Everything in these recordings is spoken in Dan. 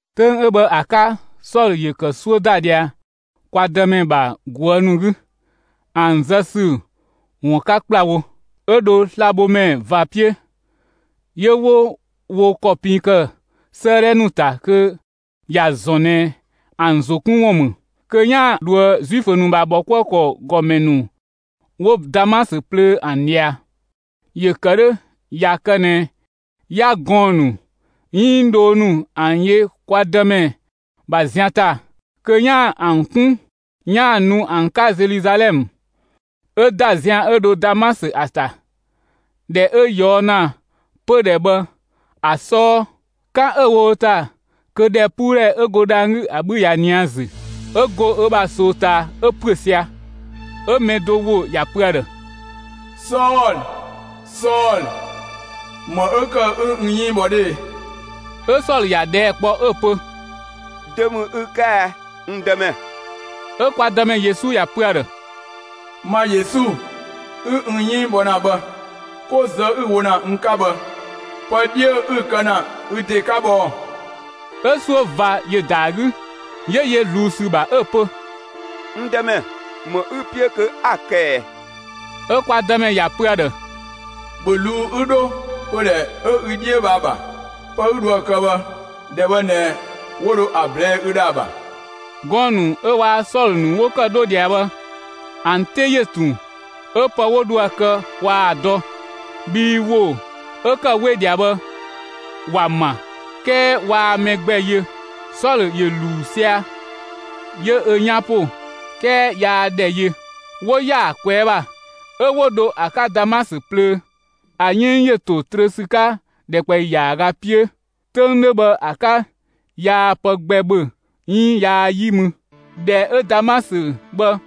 'Töng 'ö bhë ‑a 'ka, Sɔlö ‑yö ‑kë 'suö ‑da ꞊dhia kwa Dëmɛ ‑bha ꞊guë' ‑nu 'gü, ‑an zë ‑sü ‑wun 'ka ‑kplawo. 'Ö dho slabhomɛ ꞊va 'piö, 'yö 'wo wo ‑kɔ pin ‑kë 'sëëdhɛ ‑nu ‑ta kö ‑ya ‑zɔn ꞊nɛ ‑an ‑zo 'kun ‑wun ‑mü kö 'yaan‑ dhoë Zuifö ‑nu ‑bha ‑bhɔkuëkɔ ‑gɔmɛ ‑nu 'wo Damasö plöö ‑an ꞊dhia. ‑Yö ‑kë 'dhö ꞊ya kë ꞊nɛ 'ya gɔɔn‑ ‑nu 'iin dhoo ‑nu ‑an yö kwa Dëmɛ ‑bha zian ‑ta kö 'yaan‑ ‑an 'kun 'yaan‑ nu ‑an 'ka Zeluzalɛmë. 'Ö ‑da zian 'ö dho Damasö ‑a ‑ta. ꞊Dhɛ 'ö ꞊yɔɔ' ‑na pödhɛ bhë ‑a 'sɔɔ, 'kan 'ö‑ wo ‑ta 'ö ‑dhɛpuudhɛ 'ö go dhang‑ 'gü ‑a 'bhü ꞊ya ꞊nië' ‑a ‑zü. 'Ö go ö ‑bha ꞊soo ꞊taa 'ö ‑püö sia‑. 'Ö mɛ do ‑wo ‑ya pö ‑a ‑dhë: «Sɔlö, Sɔlö, ‑më 'ö ‑kë 'ü n 'yënng bhɔ 'dhö e?» 'Ö Sɔlö ‑ya ꞊dhɛɛ' kpɔ, 'ö‑ pö: «Dö ‑mü ü 'ka ɛ, n Dëmɛ?» 'Ö kwa Dëmɛ Yesu ‑ya pö ‑a ‑dhë: «Ma Yesu, 'ü n 'yënng bhɔ ‑na bhë ['ko zë 'ü‑ wo ‑na n 'ka bhë, pë 'dhiö 'ü‑ kë ‑na ü ‑de 'ka bhë ‑ɔɔ!» 'Ö 'suö ꞊va ‑yö ‑da ‑a 'gü, 'yö yö ꞊zluun ‑sü ‑bha, 'ö‑ pö: «N Dëmɛ, ‑më 'ü‑ 'piö kö 'a‑ kë ꞊ɛ?» 'Ö kwa Dëmɛ ‑ya pö ‑a ‑dhë:] «‑Bhö ꞊luu'‑ 'ü 'dho pödhɛ 'ö ü 'dhiö bhë ‑a ‑bha! Pë 'ü dhoë‑ kë bhë, ‑dhɛ bhë ꞊nɛ 'wo ‑dho ‑a ꞊blɛɛ'‑ ü ‑dhë ‑a ‑bha.» Gɔɔn‑ ‑nu 'ö waa‑ Sɔlö ‑nu 'wo ‑kë 'dho ꞊dhia bhë, ‑an 'te ‑yö ꞊tun 'ö pë 'wo dho ‑a kë waa‑ dɔ, bhii ‑wo 'ö ‑kë we ꞊dhia bhë ‑wa ‑ma, 'kɛɛ waa mɛ gbɛ yö. Sɔlö ‑yö ‑luu sia‑, 'yö ö 'yan ‑po; 'kɛɛ yaa ‑dhɛ yö. 'Wo ‑yaa ꞊kwɛɛ' ‑bha, 'ö 'wo dho ‑a 'ka Damasö plöö. ‑A 'yënng ‑yö ‑to trö ‑sü 'ka ‑dhɛkpaɔyi ‑yaaga 'piö. 'Töng 'dhö bhë ‑a 'ka, yaa pë gbɛ ‑bhö 'iin yaa 'yi mü. ‑Dhɛ 'ö Damasö bhë,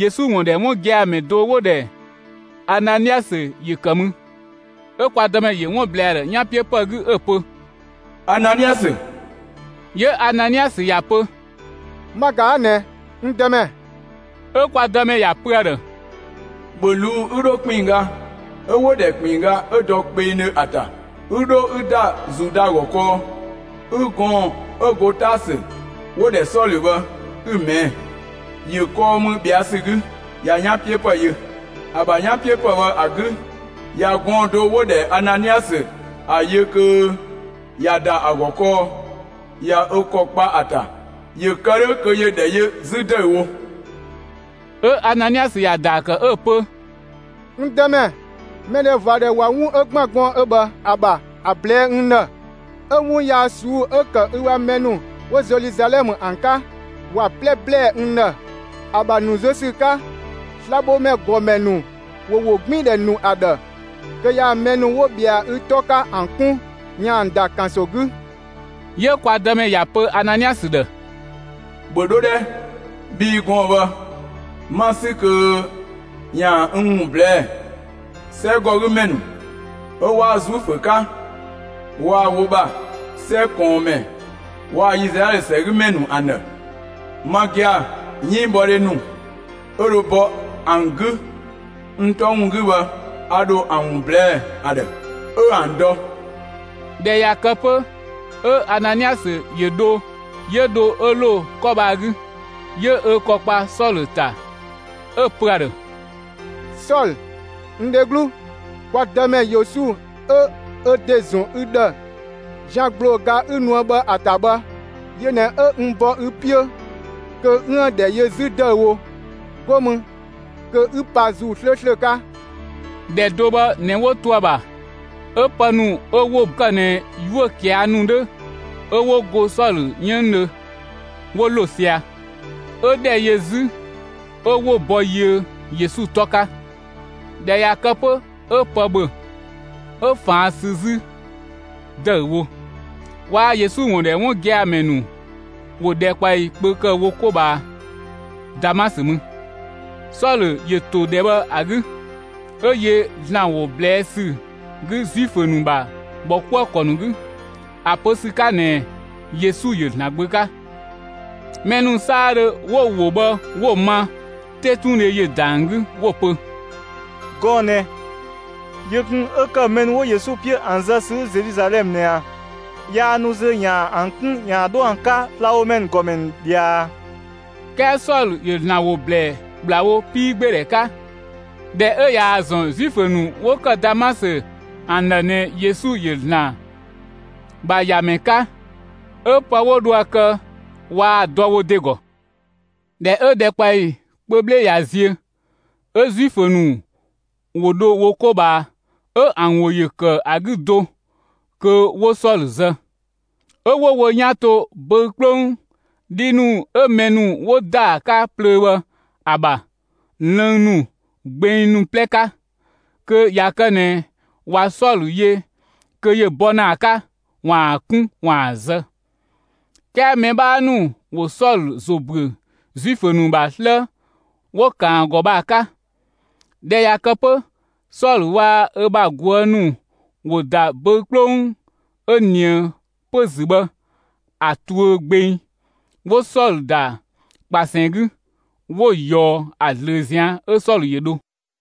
Yesu ‑wun ‑dhɛ 'wun gia‑ ‑mɛ do 'wo‑ ‑dhɛ Ananiasö ‑yö ‑kë mü. 'Ö kwa Dëmɛ ‑yö 'wun ‑blɛɛ ‑a ‑dhë 'yanpiöpë 'gü, 'ö‑ pö: «Ananiasö!» 'Yö Ananiasö ‑ya pö: «Ma ꞊ga 'a ꞊nɛ, n Dëmɛ!» 'Ö kwa Dëmɛ ‑ya pö ‑a ‑dhë: «‑Bhö ꞊luu'‑ 'ü 'dho ‑kpinngga 'ö 'wo‑ ‑dhɛ ‑kpinngga 'ö dɔ kpengdhö ‑a ‑ta, 'ü 'dho 'ü ‑da Zuda ‑gɔ kɔɔ, 'ü gɔɔn‑ 'ö go Taasö, 'wo‑ ‑dhɛ Sɔlö bhë 'ü‑ ꞊mɛɛ'‑! ‑Yö kɔɔ mü ꞊bhɛa' ‑sü 'gü. ꞊Ya 'yanpiöpë yö. ‑A ‑bha 'yanpiöpë bhë ‑a 'gü, ꞊ya gɔɔn‑ do 'wo‑ ‑dhɛ Ananiasö ‑a yö kö ꞊ya ‑da ‑a ‑gɔ kɔɔ; ꞊ya ö ‑kɔ kpa ‑a ‑ta, ‑yö kë 'dhö kö ‑yö ‑dhɛ yö 'zü ‑dëüwo.» 'Ö Ananiasö ‑ya ‑daa ‑kë 'ö‑ pö: «N Dëmɛ, mɛdhɛvadhɛ ꞊wa 'wun 'ö ‑gban gɔɔn‑ 'ö bhë ‑a ‑bha ‑a ꞊blɛɛ'‑ n ‑dhë, 'ö 'wun yaa ꞊suu'‑ 'ö‑ ‑kë ü ‑bha mɛ ‑nu 'wo Zeluzalɛmë ‑an 'ka, ‑wa 'plɛ ‑blɛɛ n ‑dhë. ‑A ‑bha ‑nu zö ‑sü 'ka, slabhomɛ ‑gɔmɛ ‑nu ‑wo ‑wogbiindhɛ ‑nu ‑a ‑dhë kö ‑yaan mɛ ‑nu 'wo ꞊bhɛa ü 'tɔ 'ka ‑an 'kun ‑yaan ‑an ‑da ‑kanso 'gü.» 'Yö kwa Dëmɛ ‑ya ‑pö Ananiasö ‑dhë: «‑Bhö 'dho 'dhɛ! Bhii gɔɔn‑ bhë, 'ma‑ 'sü kö ‑yaan n ‑wun ꞊blɛɛ'‑, 'sɛgɔgümɛ ‑nu 'ö 'waa Zuifö 'ka waa‑ wo ‑bha 'sɛ ꞊kɔɔnmɛ waa‑ Izlaɛlö ‑sɛgümɛ ‑nu ‑an ‑dhë. Ma gia‑, 'yënngbhɔdhe ‑nu 'ö dho bɔ ‑an 'gü n 'tɔ ‑wun 'gü bhë, a ‑dho ‑an ‑wun ꞊blɛɛ' ‑a ‑dhë, 'ö ‑an dɔ.» ꞊Dhɛ ꞊ya kë 'pö 'ö Ananiasö ‑yö dho. 'Yö dho 'ö ‑lo 'kɔ bhë ‑a 'gü, 'yö ö ‑kɔ kpa Sɔlö ‑ta 'ö‑ pö ‑a ‑dhë: «Sɔlö, n dheglu, kwa Dëmɛ Yesu 'ö ö ‑de ‑zɔn ü ‑dhë zian ‑gblooga 'ü nuë bhë ‑a ‑ta bhë, yö ꞊nɛ 'ö n bɔ ü 'piö kö 'üën‑ ‑dhɛ yö 'zü ‑dëüwo, 'go mü kö 'ü pa ‑Zuu 'slööslö 'ka.» ‑Dhɛ do bhë ꞊nɛ 'wo to ‑a ‑bha, 'ö pë ‑nu 'ö 'wo ‑kë ꞊nɛ 'yuö‑ ꞊kia' ‑nu 'dhö 'ö 'wo go Sɔlö 'yënngdhö, 'wo ‑lo sia‑; 'ö ‑dhɛ yö 'zü 'ö 'wo‑ ‑bɔ yiö Yesu 'tɔ 'ka. ꞊Dhɛ ꞊ya kë 'pö 'ö pë ‑bhö, 'ö ꞊faan' sü 'zü ‑dëüwo. Waa‑ Yesu ‑wun ‑dhɛ 'wun gia‑ ‑mɛ ‑nu ‑wo ‑dhɛkpaɔyi kpö ‑kë wo 'ko ꞊bhaa Damasö mü. Sɔlö ‑yö ‑to ‑dhɛ bhë ‑a 'gü, 'ö yö ‑Zlan ‑wo ꞊blɛɛ' ‑sü 'gü Zuifö ‑nu ‑bha ‑bhɔkuëkɔ ‑nu 'gü, ‑a pö ‑sü 'ka ꞊nɛ Yesu ‑yö ‑Zlan Gbö 'ka. Mɛ ‑nu 'saadhö 'wo‑ ‑wo bhë 'wo‑ ma, 'tetundhe ‑yö ‑da ‑an 'gü, 'wo‑ pö: «Gɔɔn‑ ꞊nɛ yö kun 'ö ‑kë mɛ ‑nu 'wo Yesu 'piö ‑an zë ‑sü 'gü Zeluzalɛmë ꞊nɛ ꞊a? Yaa nu zö ‑yaan ‑an 'kun ‑yaan 'dho ‑an 'ka slabhomɛ ‑gɔmɛ ‑nu ꞊dhia ꞊a?» 'Kɛɛ Sɔlö ‑yö ‑Zlan ‑wo ‑blɛɛ ‑kplawo 'piigbeedhɛ 'ka. ꞊Dhɛ 'ö ꞊yaa‑ ‑zɔn Zuifö ‑nu 'wo ‑kë Damasö ‑an ‑dhë ꞊nɛ Yesu ‑yö ‑Zlan ‑bha ‑Yamɛ 'ka, 'ö pë 'wo dho ‑a kë waa‑ dɔ wo ‑de ‑gɔ. ꞊Dhɛ 'ö ‑dhɛkpaɔyi kpö 'bhle ꞊ya ziö, 'ö Zuifö ‑nu ‑wo dho wo 'ko ꞊bhaa, 'ö ‑an ‑wo ‑yö ‑kë ‑a 'gü do kö 'wo Sɔlö zë. 'Ö 'wo wo 'yan to böü‑ 'kplong 'dhi ‑nu 'ö mɛ ‑nu ‑wo ‑da ‑a 'ka plöö bhë ‑a ‑bha, lënng ‑nu, gbeng ‑nu 'plɛ 'ka kö ꞊ya kë ꞊nɛ ꞊wa Sɔlö yö kö ‑yö bɔ ‑na ‑a 'ka, ‑waan 'kun ‑waan zë. 'Kɛɛ mɛ 'bhaa ‑nu ‑wo Sɔlö ‑zo ‑büö Zuifö ‑nu ‑bha 'slë 'wo‑ ‑kan ‑a ‑gɔ bhë ‑a 'ka. ꞊Dhɛ ꞊ya kë 'pö, Sɔlö waa‑ ö ‑bha ꞊guë' ‑nu ‑wo ‑da böü‑ 'kplong 'ö ꞊nië pö‑ ‑zü bhë ‑a tuö gbeng, 'wo Sɔlö ‑da ꞊kpasɛn 'gü, 'wo‑ ꞊yɔɔ ‑a ꞊zlöö ꞊zian' 'Ö Sɔlö ‑yö dho.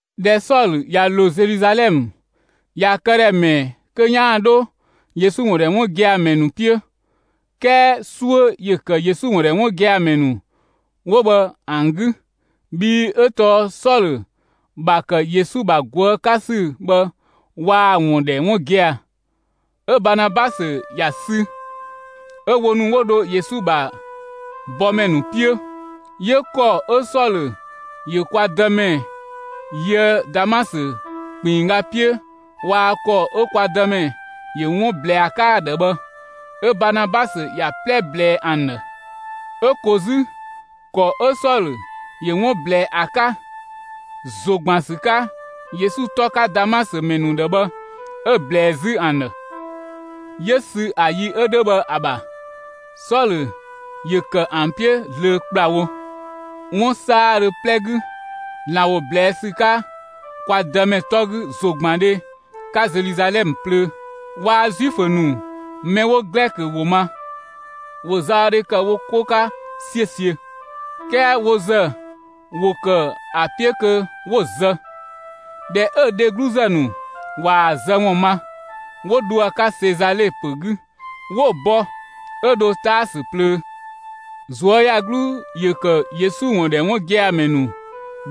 ꞊Dhɛ Sɔlö ꞊ya ‑lo Zeluzalɛmë, ‑ya këdhɛ ‑mɛɛ kö 'yaan‑ 'dho Yesu ‑wun ‑dhɛ 'wun gia‑ ‑mɛ ‑nu 'piö, 'kɛɛ 'suö ‑yö ‑kë Yesu ‑wun ‑dhɛ 'wun gia‑ ‑mɛ ‑nu 'wo bhë ‑an 'gü, bhii 'ö tɔɔ Sɔlö ‑bha ‑kë Yesu ‑bha ꞊guë' 'ka ‑sü bhë waa‑ ‑wun ‑dhɛ 'wun gia‑. 'Ö Baanabasö ‑ya sü 'ö wo ‑nu 'wo dho Yesu ‑bha bɔmɛ ‑nu 'piö, 'yö ‑kɔ 'ö Sɔlö ‑yö kwa Dëmɛ yöë Damasö ‑kpinngga 'piö waa‑ ‑kɔ 'ö kwa Dëmɛ ‑yö 'wun ꞊blɛɛ ‑a 'ka ‑a ‑dhë bhë 'ö Baanabasö ‑ya 'plɛ ꞊blɛɛ ‑an ‑dhë. 'Ö ko 'zü, ‑kɔ 'ö Sɔlö ‑yö 'wun ꞊blɛɛ ‑a 'ka, ‑zo ‑gban ‑sü 'ka, Yesu 'tɔ 'ka Damasö ‑mɛ ‑nu ‑dhë bhë 'ö‑ ꞊blɛɛ 'zü ‑an ‑dhë. 'Yö sü ‑a yi 'ö 'dhö bhë ‑a ‑bha, Sɔlö ‑yö ‑kë ‑an 'piö zlöö ‑kplawo, 'wun 'saadhö 'plɛ 'gü ‑Zlan ‑wo ꞊blɛɛ' ‑sü 'ka kwa Dëmɛ 'tɔ 'gü ‑zogbandhe 'ka Zeluzalɛmë plöö. Waa‑ Zuifö ‑nu mɛ 'wo Glɛkö ‑wo ma, ‑wo zaɔdhe ‑kë wo 'ko 'ka 'siösiö, 'kɛɛ wo ‑zë ‑wo ‑kë ‑a 'piö kö 'wo‑ zë. ꞊Dhɛ 'ö‑ dhegluzë ‑nu ꞊waa‑ zë ‑wun ma, 'wo dho ‑a 'ka Sezale ‑pö 'gü 'wo‑ bɔ 'ö dho Taasö plöö. ꞊Zuöyagluu ‑yö ‑kë Yesu ‑wun ‑dhɛ 'wun gia‑ ‑mɛ ‑nu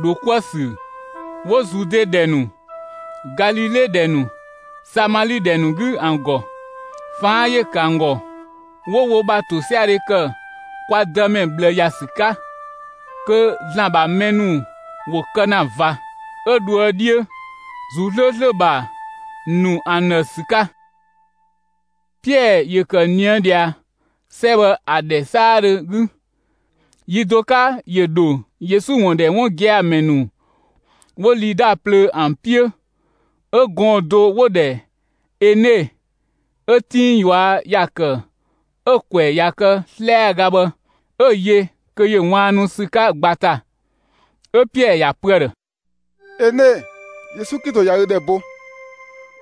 ‑dho 'kuë‑ ‑sü 'wo Zude ‑dhɛ ‑nu, Galile ‑dhɛ ‑nu, Samali ‑dhɛ ‑nu 'gü ‑an ‑gɔ. ꞊Faan' ‑yö ‑kë ‑an ‑gɔ, 'wo wo ‑bha ‑tosiadhe ‑kë kwa Dëmɛ ꞊bhlë ‑ya ‑sü 'ka, kö ‑Zlan ‑bha mɛ ‑nu ‑wo kë ‑na ꞊va, 'ö dhoë 'dhiö, ‑Zuu 'slööslö ‑bha ‑nu ‑an ‑dhë ‑sü 'ka. Piɛɛ ‑yö ‑kë ꞊nië'‑ ꞊dhia, 'sɛ bhë ‑a ‑dhɛ 'saadhö 'gü. Yi do 'ka ‑yö ‑dho Yesu ‑wun ‑dhɛ 'wun gia‑ ‑mɛ ‑nu 'wo Lida plöö ‑an 'piö. 'Ö gɔɔn‑ do 'wo‑ ‑dhɛ Ene 'ö 'tinng ꞊yua' ‑ya ‑kë 'ö‑ ‑kwɛ ꞊ya kë 'slɛaga bhë 'ö‑ yö kö ‑yö ꞊waannu ‑sü 'ka ꞊gba ‑ta. 'Ö Piɛɛ ‑ya pö ‑a ‑dhë: «Ene, Yesu Klito ꞊ya ü ‑dhɛ bo.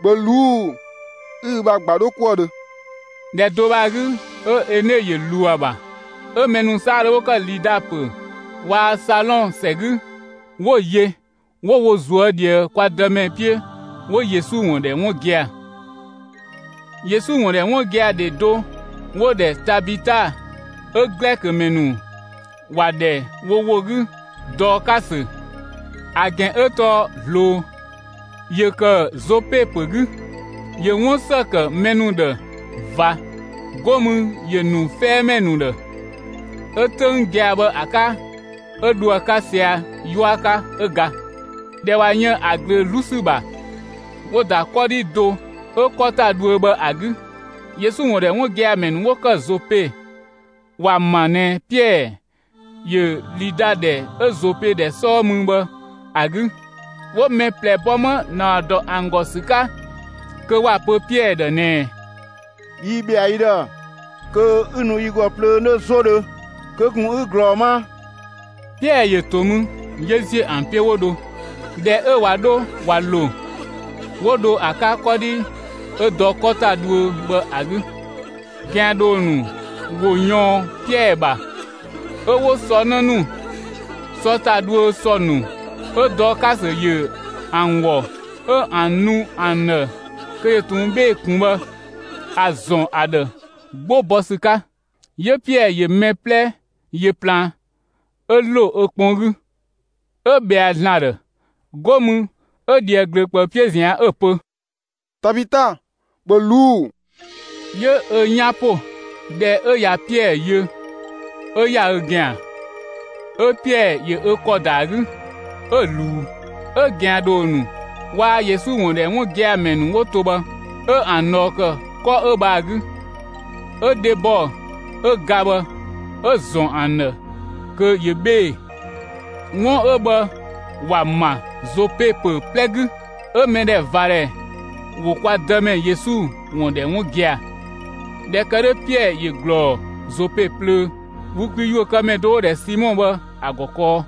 ‑Bhö ꞊luu'‑, 'ü ü ‑bha ꞊gba 'dho 'kuë‑ dhö!» ‑Dhɛ do bhë ‑a 'gü 'ö Ene ‑yö ꞊luu ‑a ‑bha. 'Ö mɛ ‑nu 'saadhö 'wo ‑kë Lida ‑pö waa‑ Salɔn ‑sɛ 'gü, 'wo‑ yö 'wo wo ꞊zuö' ꞊dhië kwa Dëmɛ 'piö 'wo Yesu ‑wun ‑dhɛ 'wun gia‑. Yesu ‑wun ‑dhɛ 'wun gia‑ ‑dhe do 'wo‑ ‑dhɛ Tabita 'ö Glɛkö ‑mɛ ‑nu ‑wa ‑dhɛ wo ‑wo 'gü «Dɔɔkasö» ‑a ‑gɛn 'ö tɔɔ «‑zloo» ‑yö ‑kë Zope ‑pö 'gü. ‑Yö 'wun ‑së ‑kë mɛ ‑nu ‑dhë ꞊va, 'go mü ‑yö ‑nu 'fɛɛmɛ ‑nu ‑dhë. 'Ö 'töng gia‑ bhë ‑a 'ka, 'ö dho ‑a 'ka sia‑ 'yua 'ka; 'ö ga. ꞊Dhɛ ꞊wa yën ‑a ꞊glöö 'zlu ‑sü ‑bha, 'wo‑ ‑da 'kɔdhi do 'ö 'kɔ ‑ta dhuö bhë ‑a 'gü. Yesu ‑wun ‑dhɛ 'wun gia‑ ‑mɛ ‑nu 'wo ‑kë Zope, ‑wa ‑ma ꞊nɛ Piɛɛ ‑yö Lida ‑dhɛ 'ö Zope ‑dhɛ 'sɔɔ mü bhë ‑a 'gü, 'wo mɛ ꞊plɛ bɔ 'ma ‑naɔ ‑dɔ ‑an ‑gɔ ‑sü 'ka kö ‑wa pö Piɛɛ ‑dhë ꞊nɛɛ: «Yi ‑bhɛa ü ‑dhë, kö 'ü nu yi ‑gɔ plöö 'nö 'zodhö; kö ꞊kun 'ü ꞊glɔɔ 'ma!» Piɛɛ ‑yö ‑to mü 'yö ‑ziö ‑an 'piö 'wo dho. ꞊Dhɛ 'ö ꞊wa 'dho ꞊wa ‑lo, 'wo dho ‑a 'ka 'kɔdhi 'ö dɔ 'kɔ ‑ta dhuö bhë ‑a 'gü. ꞊Gɛandhoo ‑nu ‑wo ꞊yɔɔn Piɛɛ ‑bha 'ö 'wo sɔ 'në ‑nu, sɔ ‑ta dhuö ‑sɔ ‑nu 'ö Dɔɔkasö ‑yö ‑an ‑wɔ 'ö ‑an nu ‑an ‑dhë kö ‑yö ꞊tun 'bhee‑ ꞊kun bhë ‑a ‑zɔn ‑a ‑dhë 'gbo bɔ ‑sü 'ka. 'Yö Piɛɛ ‑yö mɛ 'plɛ ‑yö plaan. 'Ö ‑lo ö kpɔn 'gü, 'ö ꞊bhɛa ‑Zlan ‑dhë. 'Go mü 'ö ꞊dhië ꞊glöö ꞊kpëü 'piö ꞊zian' 'ö‑ pö: «Tabita, ‑bhö ꞊luu'‑!» 'Yö ö 'yan ‑po. ꞊Dhɛ 'ö ꞊ya Piɛɛ yö, 'ö ‑ya ö ‑gɛan. 'Ö Piɛɛ ‑yö ö ‑kɔ ‑da ‑a 'gü 'ö‑ ꞊luu. 'Ö ꞊gɛandhoo ‑nu waa‑ Yesu ‑wun ‑dhɛ 'wun gia‑ ‑mɛ ‑nu 'wo to bhë, 'ö ‑an ꞊dhɔɔ ‑kë 'kɔ 'ö bhë ‑a 'gü, 'ö dhebɔ 'ö ga bhë 'ö‑ ‑zɔn ‑an ‑dhë kö ꞊yö 'bhee‑. 'Wun 'ö bhë ‑wa ‑ma Zope ‑pö 'plɛ 'gü, 'ö mɛdhɛvadhɛ ‑wo kwa Dëmɛ Yesu ‑wun ‑dhɛ 'wun gia‑. ꞊Dhɛ ‑kë 'dhö, Piɛɛ ‑yö ꞊glɔɔ Zope plöö, wü kwi ‑yuökëmɛ do 'wo‑ ‑dhɛ Simɔ bhë ‑a ‑gɔ kɔɔ.